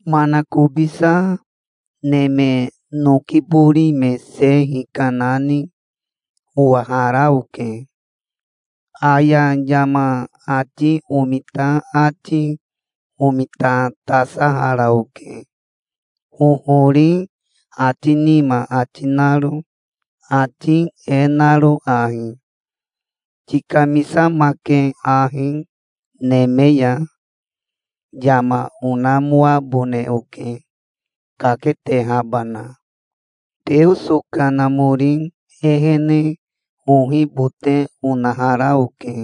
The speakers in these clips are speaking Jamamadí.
Manakobisa neme noki bori me se hikanani owahara oke. Aya yama ati omita ati omitatasahara oke, hohori ati nima ati naro, ati e naro ahi: "Tikamisamake ahi neme ya. Yama onamoabone oke, kaketehabana". Teoso Kanamori ehene ohibote onahara oke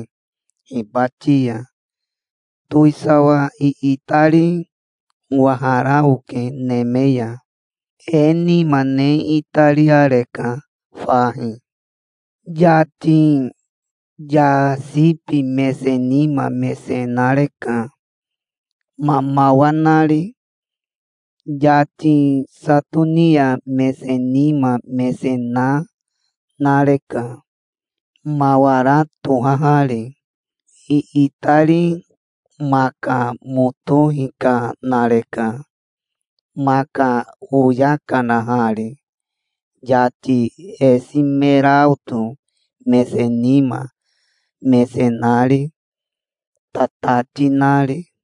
hibati ya. Towisawa iitari owahara oke neme ya. E nima ne itariareka fahi. Yati yasibi mese nima mese nareka, mamawa nari. Yati satonia mese nima mese na nareka, mawara tohahari. Iitari maka moto hikanareka, maka oya kanahari, yati esimeraoto mese nima mese nari, tatati nari.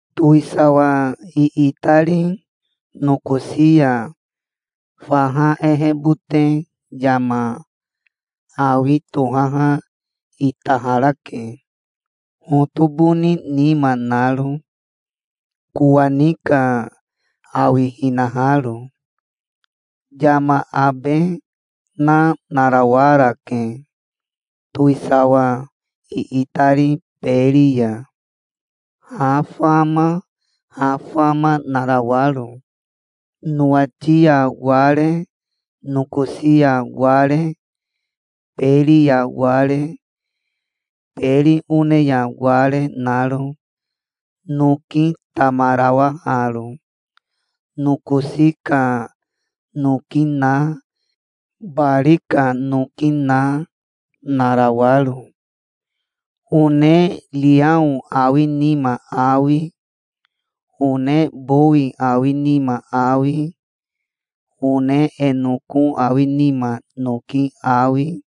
Towisawa iitari nokosi ya faha ehebote yama awi tohaha itaharake, hotoboni nima naro, kowani ka awihinaharo. Yama abe na narawarake, towisawa iitari beri ya, ha fama ha fama narawaro, nowati ya ware, nokosi ya ware, beri ya ware, beri one ya ware naro, noki tamarawaharo, nokosi ka noki na, bari ka noki na, narawaro, one riao awi nima awi, one bowi awi nima awi, one e noko awi nima noki awi,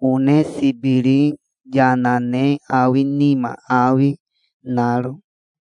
one sibiri yana ne awi nima awi naro.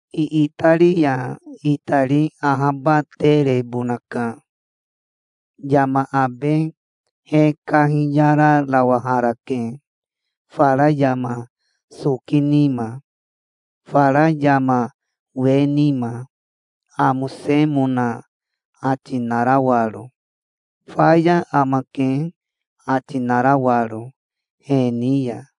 Iitari ya itari ahabaterebonaka. Yama abe he kahiyararawaharake fara yama soki nima, fara yama we nima, amosemona ati narawaro, "Faya amake", ati narawaro he ni ya.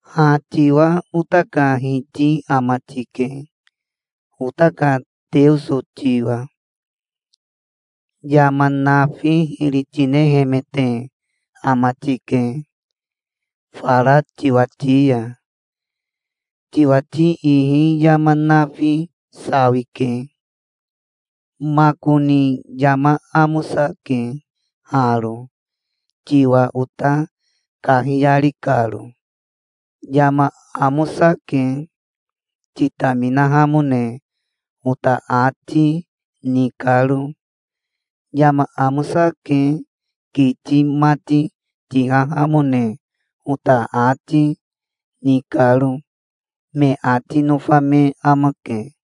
"Ha tiwa ota ka Hiti ama tike, ota ka Teoso tiwa. Yama nafi hiri tinehemete ama tike, fara tiwati ya. Tiwati ihi yama nafi sawike. Makoni yama amosake haro, tiwa ota kahiyari karo. Yama amosake, titaminahamone ota ati, ni karo. Yama amosake, kiti mati tihahamone ota ati, ni karo", me ati nofa me amake.